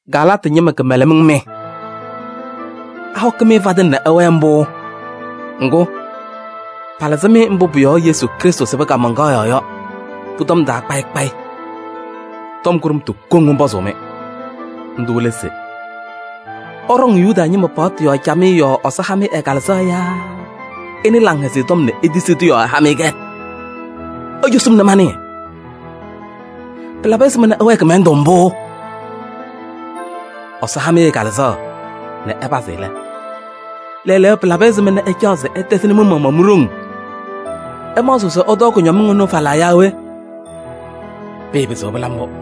Galaatɩ ñɩma kɩmɛlɛmɩŋ mɩ! Ahɔkɩ-m fadɩŋ nɛ ɩwɛɛ mbʋ? Ŋgʋ, palɩzɩ-mɩ mbʋ pʋ-yɔɔ Yesu Krɩstʋ sɩbɩ kaamaŋkaɣ yɔɔ yɔ pʋ-tɔm taa kpayɩ kpayɩ. Tɔm kʋɖʋmtʋ koŋ mɔnpɔzʋʋ-mɩ, ndʋ lɛ se: ɩɖɔŋ Yuda ñɩma paɣtʋ yɔɔ camɩyɛ yɔɔ Ɛsɔ ha-mɩ ɛ-Kalɩzaɣ yaa ɩnɩ Laŋhɛzɩyɛ Tɔm nɛ itisi-tʋ yɔɔ ɛha-mɩ-kɛ? Icosi-m nɛ manɩɩ. Pɩlabɩ ɛzɩma nɛ ɩwɛɛ kɩmɛlɛndʋ mbʋ? Ɛsɔ ha-mɩ ɛ-Kalɩzaɣ nɛ ɩpazɩ lɛ, lɛɛlɛɛyɔ pɩlabɩ ɛzɩma nɛ ɩcaɣ se ɩtɛzɩnɩ mɩ-maɣmaɣ mi-ɖoŋ? Ɩmaɣzɩɣ se ɩtɔɔ kʋñɔmɩŋ ɩnʋ falaa yaa we? Pɩɩpɩzɩɣ pɩla mbʋ.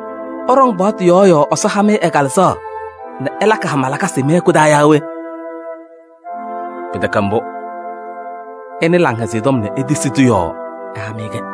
Ɩɖɔŋ paɣtʋ yɔɔ yɔɔ Ɛsɔ ha-mɩ ɛ-Kalɩzaɣ nɛ ɛlakɩ hama lakasɩ mɩ-hɛkʋ taa yaa we? Pɩtɛkɛ mbʋ! Ɩnɩ Laŋhɛzɩyɛ Tɔm nɛ itisi-tʋ yɔɔ ɛha-mɩ-kɛ.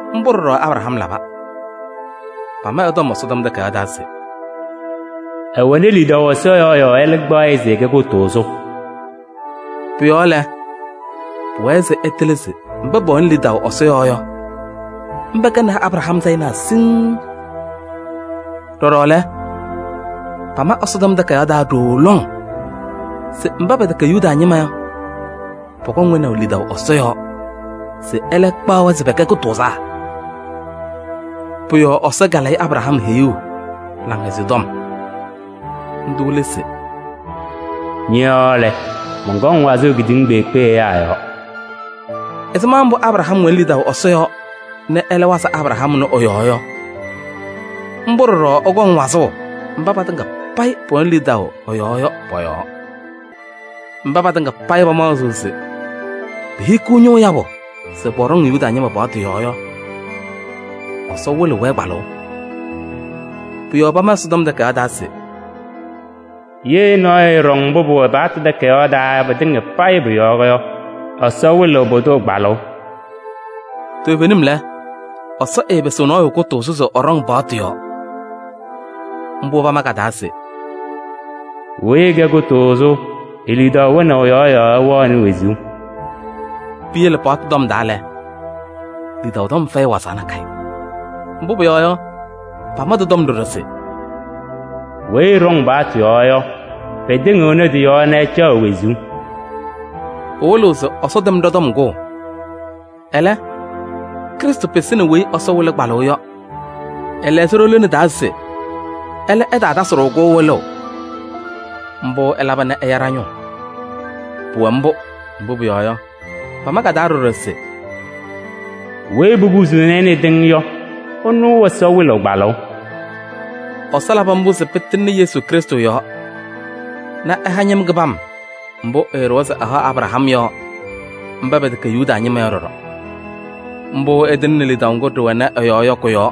Mbʋ ɖɔɖɔ Abraham laba. Pama ɛ-tɔm Ɛsɔtɔm Takayaɣ taa se: “Ɛwɛnɩ lidaʋ Ɛsɔ yɔɔ yɔɔ ɛlɛ kpaɣ-ɩ se ɛkɛ kʋtʋʋzʋ.” Pʋ-yɔɔ lɛ, pʋwɛɛ se ɩtɩlɩ se mba pɛwɛnɩ lidaʋ Ɛsɔ yɔɔ yɔ, mba kɛnɩ Abraham sayɩnaa siŋŋ. Ɖɔɖɔ lɛ, pama Ɛsɔtɔm Takayaɣ taa ɖooo lɔŋ se mba pɛtɛkɛ Yuda ñɩma yɔ, pɔkɔŋ wɛnaʋ lidaʋ Ɛsɔ yɔɔ se ɛlɛ ɛkpaɣ-wɛ se pɛkɛ kʋtʋʋzaa. Pʋ-yɔɔ Ɛsɔ kalayɩnɩ Abraham heyuu laŋhɛzɩyɛ tɔm. Ndʋ lɛ se: “Ñɔ-yɔɔ lɛ, mɔnkɔŋ wazʋʋ kedeŋa kpeekpe ɛyaa yɔɔ.” Ɛzɩma mbʋ Abraham wɛnɩ lidaʋ Ɛsɔ yɔɔ nɛ ɛwazɩ Abraham ɛnʋ ɛ-yɔɔ yɔ, mbʋ ɖɔɖɔ ɛkɔŋ wazʋʋ mba patɩŋa payɩ pɛwɛnɩ lidaʋ ɛ-yɔɔ yɔ pɔ-yɔɔ. Mba patɩŋa payɩ pamaɣzɩɣ se pehikiɣ ñʋʋ yabʋ se pɔɖɔŋ Yuda ñɩma paɣtʋ yɔɔ yɔ, Ɛsɔ wɩlɩɣ-wɛ kpalʋʋ. Pʋ-yɔɔ pama Ɛsɔtɔm Takayaɣ taa se: “Ye nɔɔyʋ ɛɛɖɔŋ mbʋ pɩwɛ paɣtʋ takayaɣ taa yɔ pɩtɩŋa payɩ pʋ-yɔɔ yɔ, Ɛsɔ ɛwɩlɩ pʋdʋ kpalʋʋ.” Toovenim lɛ, Ɛsɔ ɛɛpɩsɩɣ nɔɔyʋ kʋtʋʋzʋ se pʋdʋ ɖɔŋ paɣtʋ yɔɔ. Mbʋ pama ka-taa se: “Weyi ɛkɛ kʋtʋʋzʋ e-lidaʋ wɛnaʋ yɔɔ yɔ, ɛwɛɣ wezuu.” Piyele paɣtʋ tɔm taa lɛ, lidaʋ tɔm fɛyɩnɩ wazaɣ nakɛyɛ. Mbʋ pʋyɔɔ yɔ, pama tɩ-tɔm ɖɔɖɔ se: “Weyi ɛɖɔŋ paɣtʋ yɔɔ yɔ, pɩtɩŋɩɣnɩ tɩ-yɔɔ nɛ ɛcaɣ wezuu.” Pɩwɩlɩɣ se Ɛsɔ tɛm ɖɔ-tɔm kʋʋ. Ɛlɛ, Krɩstʋ pɩsɩnɩ weyi Ɛsɔ wɩlɩ kpalʋʋ yɔ. Ɛlɛɣzɩ ɖo-lone taa se ɛlɛ ɛtaatasɩ-ɖʋ-kʋ wɩlʋʋ. Mbʋ ɛlaba nɛ ɛya ɖa-ñʋʋ. Pʋwɛ mbʋ, mbʋ pʋyɔɔ yɔ, pama ka-taa ɖɔɖɔ se: “Weyi popusuuni-i nɛ tɩʋ yɔ, ɛnʋ Ɛsɔ wɩlɩɣ kpalʋʋ.” Ɛsɔ labɩ mbʋ se pɩtɩŋnɩ Yesu Krɩstʋ yɔɔ nɛ ɛha ñɩm kɩbam mbʋ ɛɖʋwa se ɛhaɣ Abraham yɔ mba pɛtɛkɛ Yuda ñɩma yɔ ɖɔɖɔ. Mbʋ ɛtɩŋnɩ lidaʋ ŋgʋ ɖɩwɛnɩ ɛ-yɔɔ yɔ kʋ-yɔɔ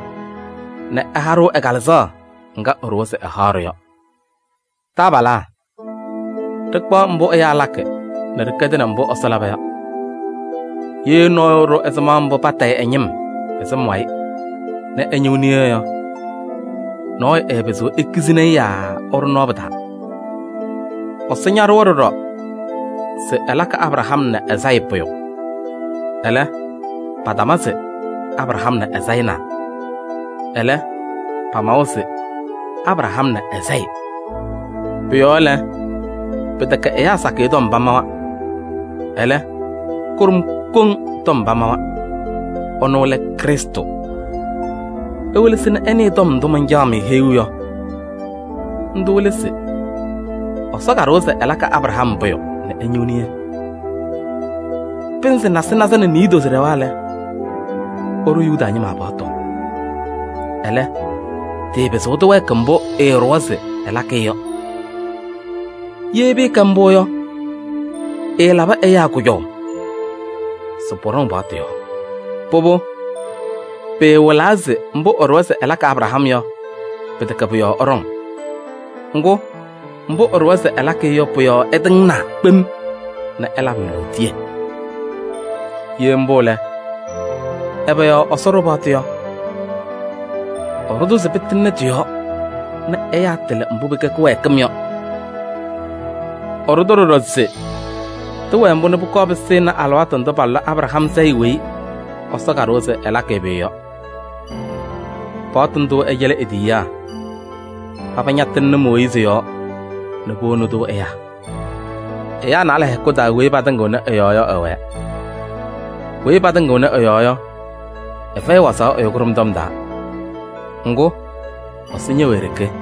nɛ ɛha-ɖʋ ɛ-Kalɩzaɣ ŋga ɛɖʋwa se ɛhaɣ-ɖʋ yɔ. Taabalaa! Ɖɩkpaɣ mbʋ ɛyaa lakɩ nɛ ɖɩkɛdɩnɩ mbʋ Ɛsɔ laba yɔ: ye nɔɔyʋ ɛɖʋ ɛzɩma mbʋ patayɩ ɛ-ñɩm ɛ-sɩm wayɩ nɛ ɛ-ñɩɣ niye yɔ, nɔɔyʋ ɛɛpɩzɩɣ ekizini-i yaa ɛɖʋ nɔɔ pɩ-taa. Ɛsɔ ñaɖʋwa ɖɔɖɔ se ɛlakɩ Abraham nɛ ɛ-sayɩ pʋyʋ. Ɛlɛ, patama se: “Abraham nɛ ɛ-sayɩnaa.” Ɛlɛ, pamawa se: “Abraham nɛ ɛ-sayɩ.” Pʋ-yɔɔ lɛ, pɩtɛkɛ ɛyaa sakɩyɛ tɔm pamawa, ɛlɛ, kʋɖʋm koŋ tɔm pamawa. Ɛnʋ lɛ Krɩstʋ. Iwelesi nɛ ɩnɩɩ tɔm ndʋ mancaɣ-mɩ heyuu yɔ. Ndʋ lɛ se: Ɛsɔ kaɖʋwa se ɛlakɩ Abraham pʋyʋ nɛ ɛñɩɣ niye. Pɩnzɩ nasɩnaza nɛ niidozo ɖɛwa lɛ, ɛɖʋ Yuda ñɩma paɣtʋ. Ɛlɛ, tɩɩpɩzɩɣ tɩwɛɛkɩ mbʋ ɛɖʋwa se ɛlakɩ-ɩ yɔ. Ye pɩɩkɛ mbʋ yɔ, ɛɛlabɩ ɛyaa kʋjɔʋ se pɔɖɔŋ paɣtʋ yɔɔ. Pʋbʋ pɩɩwɩlaa se mbʋ ɛɖʋwa se ɛlakɩ Abraham yɔ, pɩtɛkɛ pʋ-yɔɔ ɛɖɔŋ. Ŋgʋ, mbʋ ɛɖʋwa se ɛlakɩ-ɩ yɔ pʋ-yɔɔ ɛtɩŋnaa kpem nɛ ɛlabɩ-ɩ lootiye. Ye mbʋ lɛ, ɛbɛ yɔɔ Ɛsɔ ɖʋ paɣtʋ yɔ? Ɛɖʋ-tʋ se pɩtɩŋnɩ tɩ-yɔɔ nɛ ɛyaa tɩlɩ mbʋ pɩkɛ kɩwɛɛkɩm yɔ. Ɛɖʋ-tʋ ɖɔɖɔ se tɩwɛɛ mbʋ nɛ pʋkɔɔ pɩsɩnɩ alɩwaatʋ ndʋ palʋlɩ Abraham sayɩ weyi Ɛsɔ kaɖʋwa se ɛlakɩ-ɩ pʋyʋ yɔ. Paɣtʋ ndʋ ɛcɛlɩ e-tiyiyaa. Paba ñatɩŋnɩ Mooyiizi yɔɔ nɛ powoni-tʋ ɛyaa. Ɛyaa naalɛ hɛkʋ taa weyi patɩŋɩɣnɩ ɛ-yɔɔ yɔ ɛwɛɛ. Weyi patɩŋɩɣnɩ ɛ-yɔɔ yɔ, ɛfɛyɩ wazaɣ ɛyʋ kʋɖʋm tɔm taa. Ŋgʋ, Ɛsɔ ñɛwɛ e-ɖeke.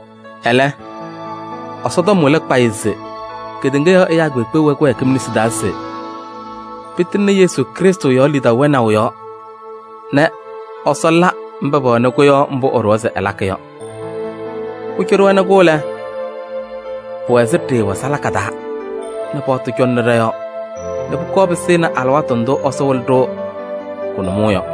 Ɛlɛ, Ɛsɔtɔm wɩlɩ kpayɩ se kedeŋa yɔɔ ɛyaa kpeekpe wɛ kɩwɛɛkɩm nesi taa se pɩtɩŋnɩ Yesu Krɩstʋ yɔɔ lidaʋ wɛnaʋ yɔɔ nɛ Ɛsɔ la mba pɛwɛnɩ-kʋ yɔ mbʋ ɛɖʋwa se ɛlakɩ yɔ. Pʋcɔ ɖɩwɛnɩ-kʋ lɛ, pɩwɛ ɛzɩ ɖɩɩwɛ salaka taa nɛ paɣtʋ cɔŋnɩ ɖɔ-yɔɔ nɛ pʋkɔɔ pɩsɩnɩ alɩwaatʋ ndʋ Ɛsɔ wɩlɩ-ɖʋ kʋ-nʋmɔʋ yɔ.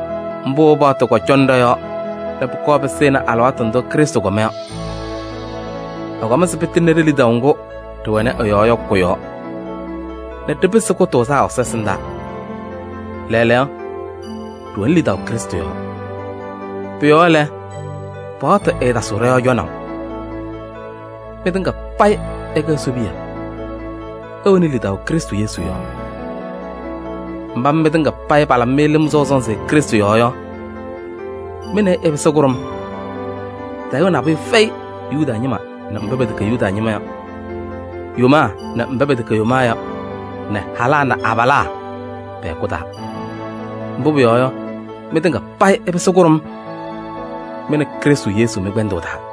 Mbʋ paɣtʋ kɔcɔnɩ ɖɔ-yɔɔ nɛ pʋkɔɔ pɩsɩnɩ alɩwaatʋ ndʋ Krɩstʋ kɔma yɔ. Ɛkɔm se pɩtɩŋnɩ ɖe-lidaʋ ŋgʋ ɖɩwɛnɩ ɛ-yɔɔ yɔ kʋ-yɔɔ nɛ ɖɩpɩsɩ kʋtʋʋzaa Ɛsɔ ɛsɩndaa. Lɛɛlɛɛyɔ, ɖɩwɛnɩ lidaʋ Krɩstʋ yɔɔ. Pʋ-yɔɔ lɛ, paɣtʋ ɛɛtasɩɣ ɖɔ-yɔɔ cɔnaʋ. Mɩtɩŋa payɩ ɩkɛ Ɛsɔ piya: ɩwɛnɩ lidaʋ Krɩstʋ Yesu yɔɔ. Mba mɩ mɩtɩŋa payɩ palabɩ lɩm sɔʋ sɔnzɩ Krɩstʋ yɔɔ yɔ, mɩ nɛ ɩ ɩpɩsɩ kʋɖʋm. Tayʋʋ nabʋyʋ fɛyɩ Yuda ñɩma nɛ mba pɛtɛkɛ Yuda ñɩma yɔ, yomaa nɛ mba pɛtɛkɛ yomaa yɔ, nɛ halaa nɛ abalaa, pɛ-hɛkʋ taa. Mbʋ pʋyɔɔ yɔ, mɩtɩŋa payɩ ɩpɩsɩ kʋɖʋm, mɩ nɛ Krɩstʋ Yesu mɩ-kpɛndʋʋ taa.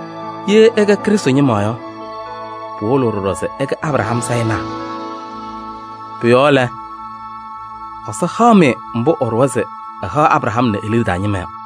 Ye ɩkɛ Krɩstʋ ñɩma yɔ, pɩwɩlɩɣ ɖɔɖɔ se ɩkɛ Abraham sayɩnaa. Pʋ-yɔɔ lɛ, Ɛsɔ haɣ-mɩ mbʋ ɛɖʋwa se ɛhaɣ Abraham nɛ e-liɖe taa ñɩma yɔ.